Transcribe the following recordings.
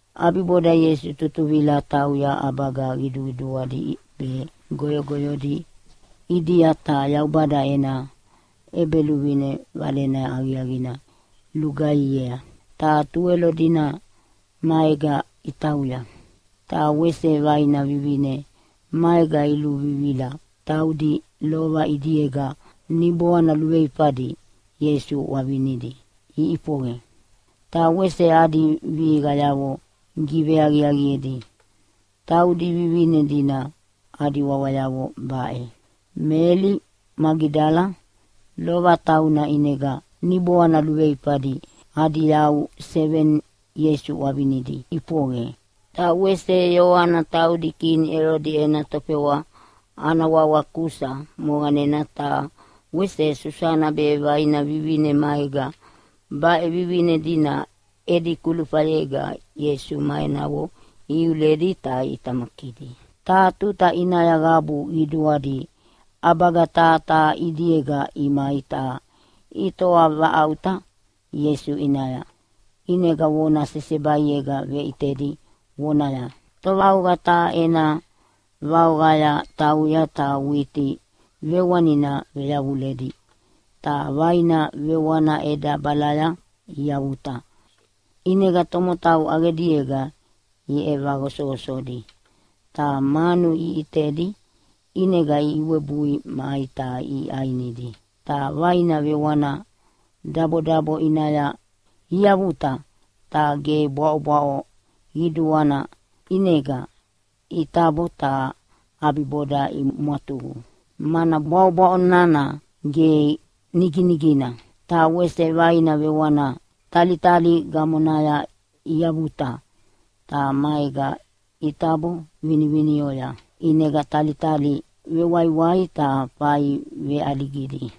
ʼAbiboda Ieisu tutuvila tauya ʼabaga qiduqiduadi be goyogoyodi ʼidia ta Yaubada ena ʼEbeluvine valena aqiaqina lugaihiea. Ta Tuwelo dina maega itauya. Ta wese vaina vivine maega iluvivila, taudi lova ʼidiega niboana luveifadi Ieisu ʼwavinidi iʼifoqe, ta wese adi vihiqayavo giveaqiaqiedi. Taudi vivine dina adi wawayavo baʼe: Meli Magidala, lova tauna ʼinega niboana luveifadi adi yau seveni Ieisu ʼwavinidi iʼifoqe, ta wese Ioana, taudi kini Elodi ena tofewa ana wawa Kusa moqanena, ta wese Susana be vaina vivine maega. Baʼe vivine dina edi kulufayega Ieisu ma enavo ihiuledi ta iʼitamakidi. Taha tuta ʼinaya qabu qiduadi ʼabaga taha taha ʼidiega imai ta itoavaʼauta Ieisu ʼinaya. ʼInega vona sesebaiega veʼitedi vonaya, “Tovaoqa taha ena vaoqaya tauya ta witi vewanina veyavuledi, ta vaina vewana ʼedabalaya iavuta, ʼinega tomotau ʼaqediega iʼevaqosoqosodi, ta manu iʼitedi ʼinega iwebui mai ta iʼainidi. Ta vaina vewana dabodabo ʼinaya iavuta ta ge bwaʼobwaʼo qiduana, ʼinega itabo ta ʼabiboda imwatuqu, mana bwaʼobwaʼo nana ge niginigina. Ta wese vaina vewana talitali gamonaya iavuta, ta maega itabo vinivinioya, ʼinega talitali vewaiwai ta fai veʼaligidi.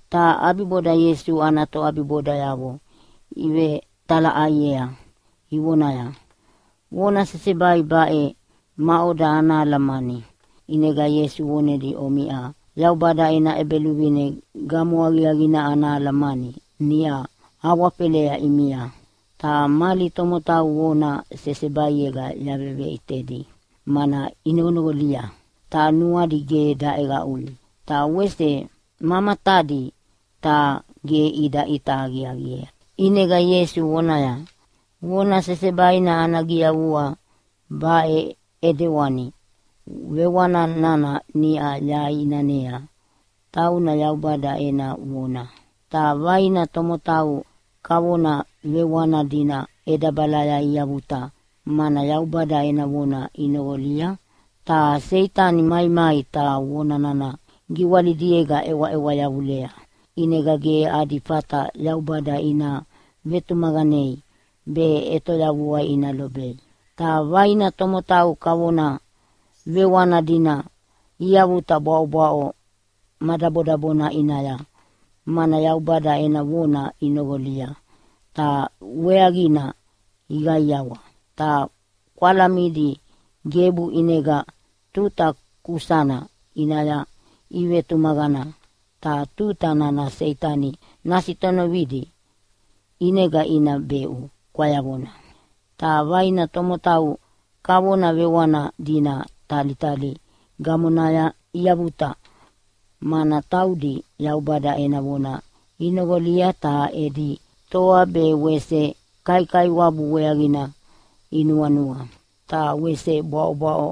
Ta ʼabiboda Ieisu ana toʼabibodayavo ivetalaʼaiea ivonaya, “Vona sesebai baʼe, maʼoda ana alamani?” ʼInega Ieisu vonedia, “Omiʼa Yaubada ena ʼEbeluvine gamo aqiaqina ana alamani niʼa awafelea ʼimia. ‘Ta mali tomotau vona sesebaiega yaveveʼitedi, mana inoqonoqolia ta nuadi ge daʼeqaʼui, ta wese ma matadi, ta ge ida ʼita aqiaqiea.’” ʼInega Ieisu vonaya, “Vona sesebaina ana giyavua baʼe ʼedewana: Vewani nana niʼa yaʼinanea tauna Yaubada ena vona. Ta vaina tomotau kavona vewana dina ʼedabalaya iavuta, mana Yaubada ena vona inoqolia, ta Seitani maimai ta vona nana giwalidiega ʼewaʼewa yavulea, ʼinega ge adi fata Yaubada ina vetumaqanei be ʼetoyavua ina lobei. Ta vaina tomotau kavona vewana dina iavuta bwaʼobwaʼo ma dabodabona ʼinaya, mana Yaubada ena vona inoqolia ta weaqina iqaiawa. Ta kwalamidi gebu, ʼinega tuta kukusana ʼinaya ivetumaqana, ta tuta nana Seitani nasitonovidi ʼinega ina beʼu kwayavona. Ta vaina tomotau kavona vewana dina talitali gamonaya iavuta, mana taudi Yaubada ena vona inoqolia, ta edi toa be wese kaikaiwabu weaqina inuanua, ta wese bwaʼobwaʼo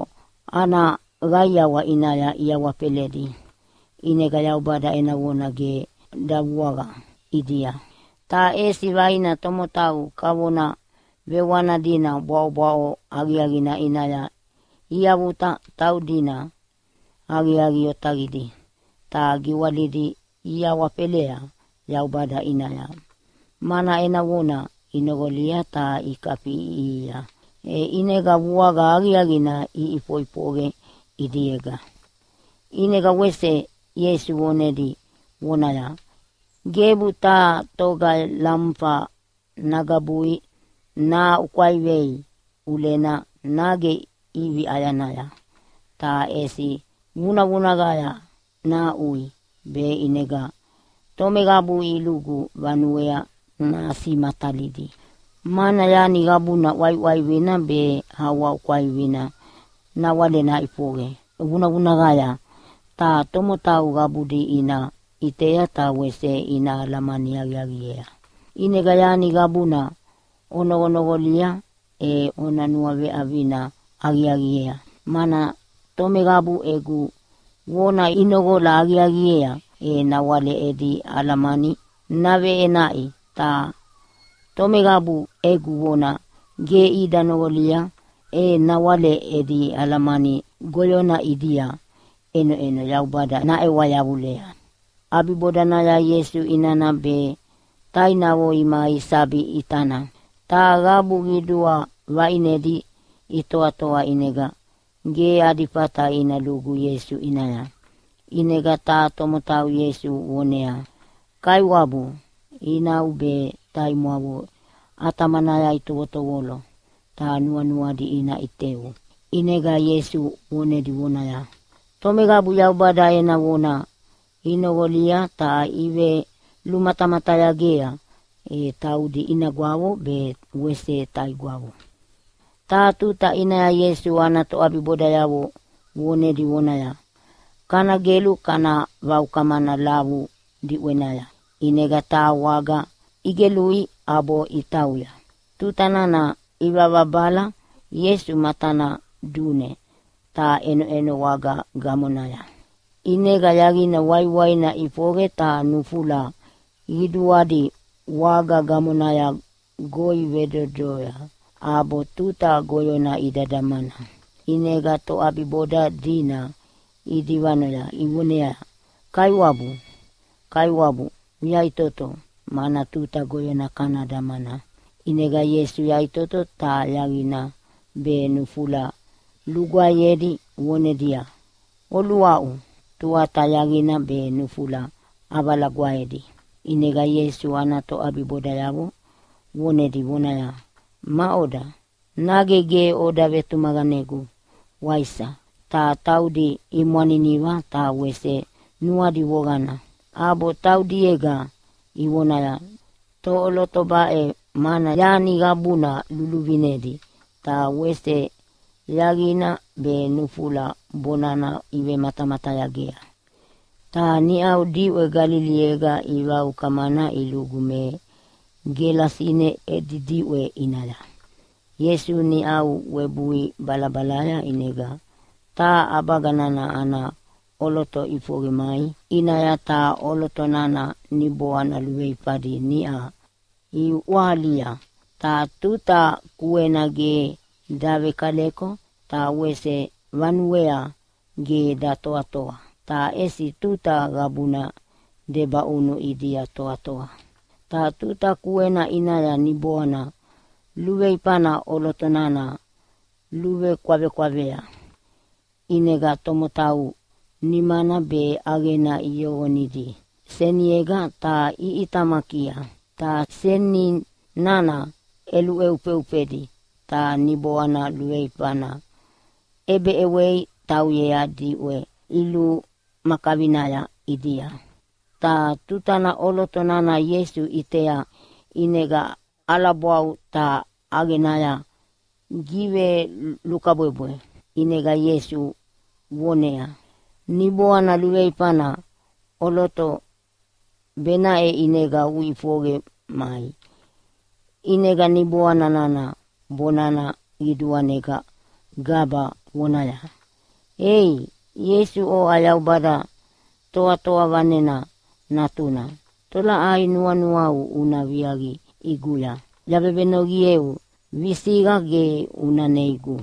ana qaiawa ʼinaya iawafeledi, ʼinega Yaubada ena vona ge davuaqa ʼidia. Ta ʼesi vaina tomotau kavona vewana dina bwaʼobwaʼo aqiaqina ʼinaya iavuta. Taudina aqiaqi otaqidi ta giwalidi iawafelea Yaubada ʼinaya, mana ena vona inoqolia ta ikafiʼiʼihia, e ʼinega vuaqa aqiaqina ʼifoʼifoqe ʼidiega.” ʼInega wese Ieisu vonedi vonaya, “Gebu taha toga lamufa nagabui nahaʼukwaivei ʼulena nage ʼivi ʼayanaya, ta ʼesi vunavunaqaya nahaʼui be ʼinega tomeqabu ilugu vanuea nasimatalidi. “Mana yani qabuna ʼwaiʼwaivina be aʼuaʼukwaivina nawale naʼifoqe vunavunaqaya ta tomotau qabudi ina ʼitea ta wese ina alamani aqiaqiea. “ʼInega yani qabuna onoqonoqolia e ona nuaveʼavina aqiaqiea. Mana tomeqabu egu vona inoqola aqiaqiea e nawale edi alamani naveʼenaʼi. Ta tomeqabu egu vona ge ida noqolia, e nawale edi alamani goyona ʼidia ʼenoʼeno Yaubada naʼewa yavulea.” ʼAbibodanaya Ieisu inana be tainavo imai sabi ʼitana. Ta qabu qidua vaʼinedi itoatoa, ʼinega ge adi fata ina lugu Ieisu ʼinaya. ʼInega taha tomotau Ieisu voneaya, “Kaiwabu, inau be taimwavo ʼatamanaya itovotovolo, ta nuanuadi ina ʼiteu.” ʼInega Ieisu vonedi vonaya, “Tomeqabu Yaubada ena vona inoqolia ta ivelumatamatayagea, e taudi inagwavo be wese taigwavo.” Taha tuta ʼinaya Ieisu ana toʼabibodayavo vonedi vonaya, “Kana gelu kana vaukamana lavu diʼwenaya.” ʼInega taha waga igelui ʼabo itauya. Tuta nana ivavabala Ieisu matana dune ta ʼenoʼeno waga gamonaya. ʼInega yaqina waiwaina ʼifoqe ta nufula qiduadi waga gamonaya goi vedodoya, ʼabo tuta goyona ida damana. ʼInega toʼabiboda dina idivanoya ivoneaya, “Kaiwabu, Kaiwabu, uyaʼitoto mana tuta goyona kana damana!” ʼInega Ieisu yaʼitoto, ta yaqina be nufula lugwaeyedi vonedia, “Oluaʼu!” Tuata yaqina be nufula ʼavalagwaedi. ʼInega Ieisu ana toʼabibodayavo vonedi vonaya, “Maʼoda? Nage ge oda vetumaqanegu, waisa?” Ta taudi imwaniniva ta wese nuadi voqana, ʼabo taudiega ivonaya, “Toʼoloto baʼe, mana yani qabuna luluvinedi, ta wese yaqina be nufula bonana ivematamatayagea?” Ta niʼau diʼwe Galiliega ivaukamana ilugu me Gelasine edi diʼwe ʼinaya. Ieisu niʼa webui balabalaya, ʼinega taha ʼabaga nana ana ʼoloto ʼifoqe mai ʼinaya. Ta ʼoloto nana niboana luveifadi niʼa iʼwahalia. Ta tuta kuena ge davekaleko ta wese vanuea ge datoatoa, ta ʼesi tuta qabuna debaʼunu ʼidia toatoa. Ta tuta kuena ʼinaya niboana luveifana ʼoloto nana luvekwavekwavea, ʼinega tomotau nimana be ʼaqena iyoqonidi seniega ta iʼitamakia. Ta seni nana ʼeluhufeufedi ta niboana luveifana ʼebeʼewei tauyea diʼwe ilumakavinaya ʼidia. Ta tutana ʼoloto nana Ieisu ʼitea ʼinega ʼalabwau ta ʼaqenaya givelukabwebwe. ʼInega Ieisu voneaya, “Niboana luveifana, ʼoloto benaʼe ʼinega uʼifoqe mai!” ʼInega niboana nana bonana qiduanega gaba vonaya, “Ei Ieisu, oʼa Yaubada Toatoa Vanena Natuna, tolaʼai nuanuau una viaqi ʼiguya? Yavevenoqieu, visiqa ge una neigu.”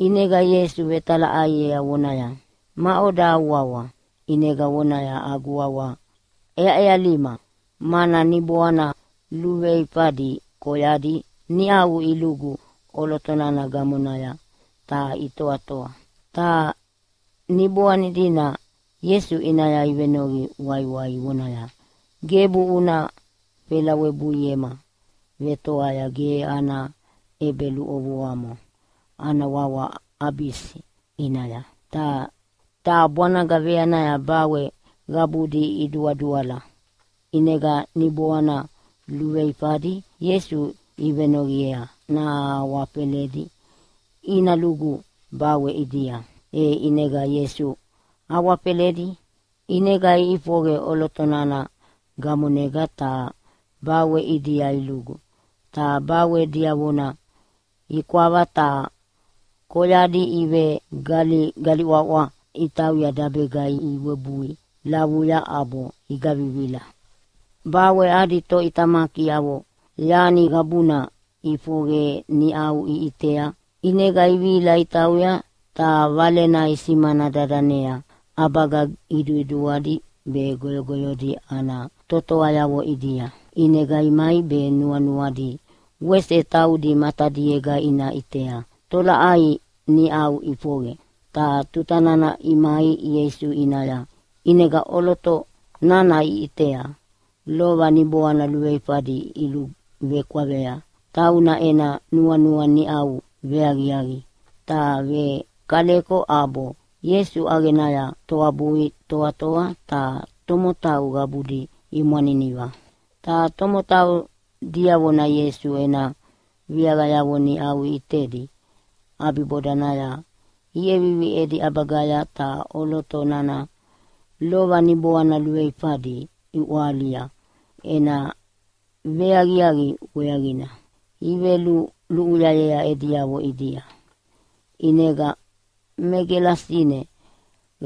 ʼInega Ieisu vetalaʼaiea voneaya, “Maʼoda au wawa?” ʼInega vonaya, “Agu wawa ʼEaʼealima”, mana niboana luveifadi koyadi niʼau ilugu ʼoloto nana gamonaya ta itoatoa. Ta niboani dina Ieisu ʼinaya ivenoqi waiwai ivonaya, “Gebu una felawebuiema vetoa ge ana ʼebeluʼovoamo ana wawa Abisi ʼinaya.” Ta taha bwanaga veanaya bawe qabudi iduaduala. ʼInega niboana luveifadi Ieisu ivenoqiea nahawafeledi ina lugu bawe ʼidia, e ʼinega Ieisu awafeledi. ʼInega iʼifoqe ʼoloto nana gamonega ta bawe ʼidia ilugu, ta bawe diavona ikwava ta koyadi ivegaligaliʼwaʼwa itauya dabega iwebui lavuya ʼabo igavivila. Bawe adi toʼitamakiavo yani qabuna ʼifoqe niʼa iʼitea, ʼinega ivihila itauya, ta valena isimana dadanea ʼabaga qiduqiduadi be goyogoyodi ana totoayavo ʼidia. ʼInega imai be nuanuadi wese taudi matadiega ina ʼitea tolaʼai niʼa ʼifoqe. Ta tutana imai Ieisu ʼinaya ʼinega ʼoloto nana iʼitea lova niboana luveifadi iluvekwavea. Tauna ena nuanua niʼau veaqiaqi ta vekaleko ʼabo Ieisu ʼaqenaya toabui toatoa. Ta tomotau qabudi imwaniniva. Ta tomotau diavona Ieisu ena viaqayavo niʼa iʼitedi ʼabibodanaya iʼevivi edi ʼabagaya ta ʼoloto nana lova niboana luveifadi iʼwahalia ena veaqiaqi weaqina iveluluʼuyayea ediavo ʼidia. ʼInega me Gelasine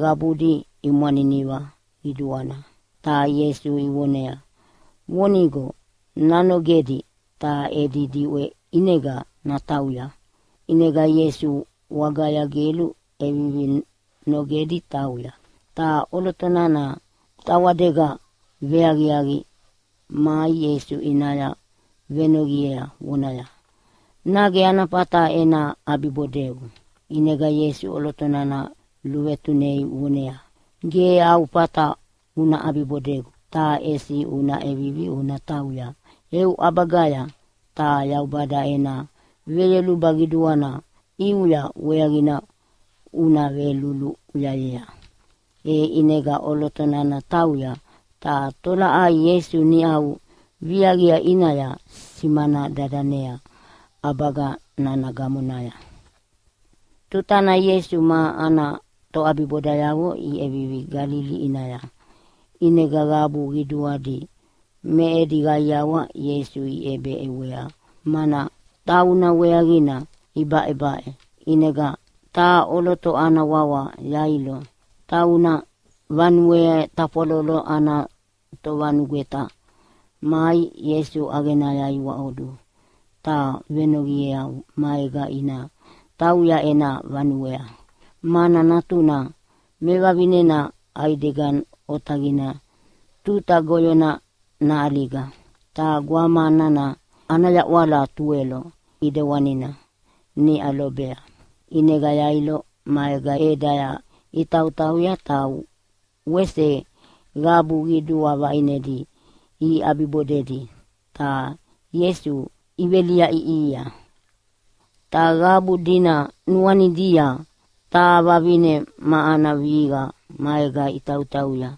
qabudi imwaniniva qiduana ta Ieisu ivonea vonigo nanogedi ta edi diʼwe ʼinega natauya. ʼInega Ieisu wagaya gelu ʼevivi nogedi tauya. Ta ʼoloto nana tawadega veaqiaqi mai Ieisu ʼinaya venoqiea vonaya, “Nage ana fata ena ʼabibodeu?” ʼInega Ieisu ʼoloto nana luvetunei voneaya, “Ge au fata una ʼabibodegu, ta ʼesi una ʼevivi una tauya eu ʼabagaya, ta Yaubada ena veyoluba qiduana ʼiuya weaqina una veluluʼuyayea.” E ʼinega ʼoloto nana tauya, ta tolaʼai Ieisu niʼa viaqia ʼinaya simana dadanea ʼabaga nana gamonaya. Tutana Ieisu ma ana toʼabibodayavo iʼevivi Galili ʼinaya, ʼinega qabu qiduadi me edi qaiawa Ieisu iʼebeʼewea, mana tauna weaqina ibaʼebaʼe. ʼInega taha ʼoloto ana wawa Yailo, tauna vanue tafwalolo ana tovanugweta, mai Ieisu ʼaqenaya iwaʼodu ta venoqiea maega ina tauya ena vanuea, mana natuna mevavinena ʼaidega otaqina tuta goyona naʼaliga. Ta gwama nana ana yaʼwala tuwelo ʼidewana niʼa lobea. ʼInega Yailo maega ʼedaya itautauya, ta wese qabu qidua vaʼinedi iʼabibodedi ta Ieisu iveliaʼiʼia. Ta qabu dina nuanidia taha vavine ma ana vihiqa maega itautauya.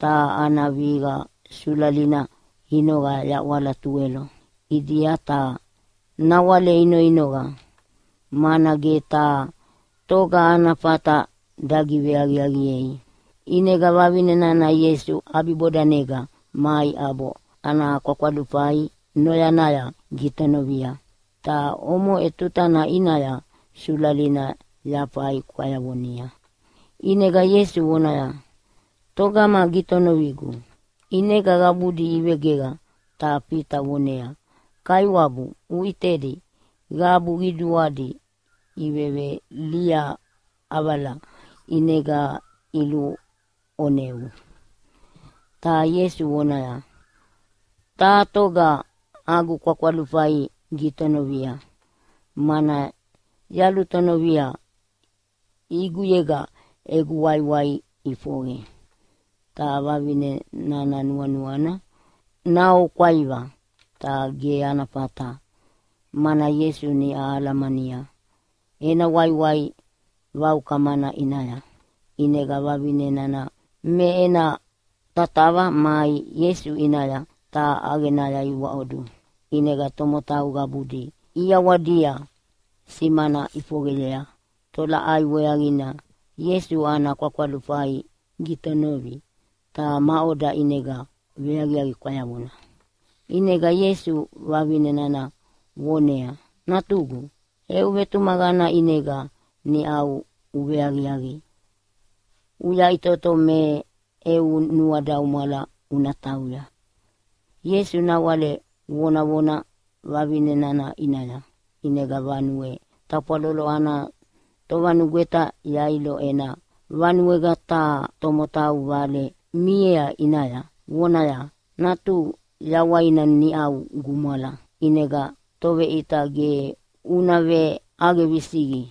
Ta ana vihiqa sulalina inoqa yaʼwala tuwelo ʼidia, ta nawale inoinoqa, mana ge taha toga ana fata dagiveaqiaqiei. ʼInega vavine nana Ieisu ʼabibodanega mai ʼabo ana kwakwalufai noyana gitonovia, ta omoʼe tutana ʼinaya sulalina yafaha kwayavonia. ʼInega Ieisu vonaya, “Togama gitonovigu?” ʼInega qabudi ivegeqa ta Fita voneaya, “Kaiwabu, uʼitedi qabu qiduadi iveveliaʼavala ʼinega iluʼoneu.” Ta Ieisu voneaya, “Taha toga agu kwakwalufai gitonovia, mana yalutonovia ʼiguyega egu waiwai ʼifoqe.” Ta vavine nana nuanuana naoukwaiva, ta ge ana fata mana Ieisu niʼa alamania ena waiwai vaukamana ʼinaya. ʼInega vavine nana me ena tatava mai Ieisu ʼinaya ta ʼaqenaya iwaʼodu. ʼInega tomotau qabudi ʼiawadia simana ʼifoqeyea tolaʼai weaqina Ieisu ana kwakwalufai gitonovi, ta maʼoda ʼinega veaqiaqi kwayavona. ʼInega Ieisu vavine nana voneaya, “Natugu, eu vetumaqana ʼinega niʼa uveaqiaqi. Uyaʼitoto me eu nuadaumwala una tauya.” Ieisu nawale vonavona vavine nana ʼinaya, ʼinega vanue tafwalolo ana tovanugweta Yailo ena vanuega taha tomotau vale miea ʼinaya vonaya, “Natuhu yawaina niʼa gumwala, ʼinega Toveʼita ge una veʼaqe visiqi.”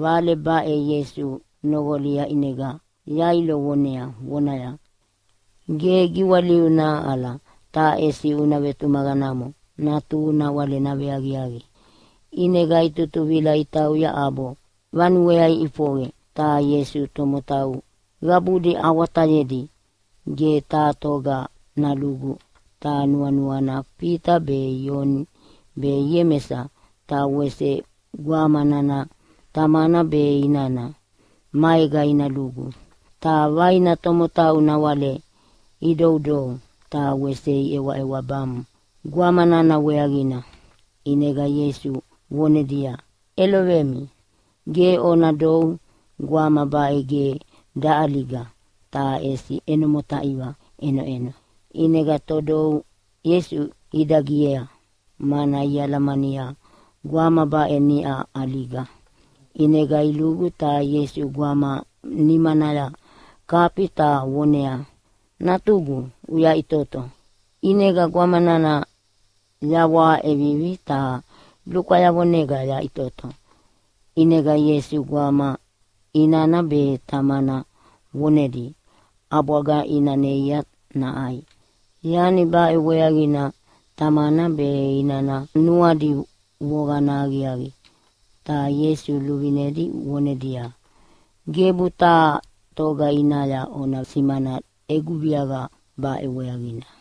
Vale baʼe Ieisu noqolia ʼinega Yailo vonea vonaya, “Ge giwaliu nahaʼala, ta ʼesi una vetumaqanamo, natuhu nawale naveaqiaqi.” ʼInega itutuvila itauya ʼabo vanuea iʼifoqe. Ta Ieisu tomotau qabudi awatayedi ge taha toga nalugu. Ta nuanuana Fita be, Ioni be Iemesa ta wese gwama nana tamana be inana maega ina lugu. Ta vaina tomotau nawale idoudou ta wese iʼewaʼewabamu gwama nana weaqina. ʼInega Ieisu vonedia, “ʼElovemi, ge ona dou! Gwama baʼe ge daʼaliga ta ʼesi ʼeno motaiva ʼenoʼeno.” ʼInega todou Ieisu idagiea, mana ialamania gwama baʼe niʼa ʼaliga. ʼInega ilugu ta Ieisu gwama nimanaya kafi ta voneaya, “Natugu, uyaʼitoto!” ʼInega gwama nana yawaha ʼevivi ta lukwayavonega yaʼitoto. ʼInega Ieisu gwama inana be tamana vonedi ʼabwaga ina neia naʼai. Yani baʼe weaqina tamana be inana nuadi voqana aqiaqi. Ta Ieisu luvinedi vonedia, “Gebu taha toga ʼinaya ona simana egu viaqa baʼe weaqina.”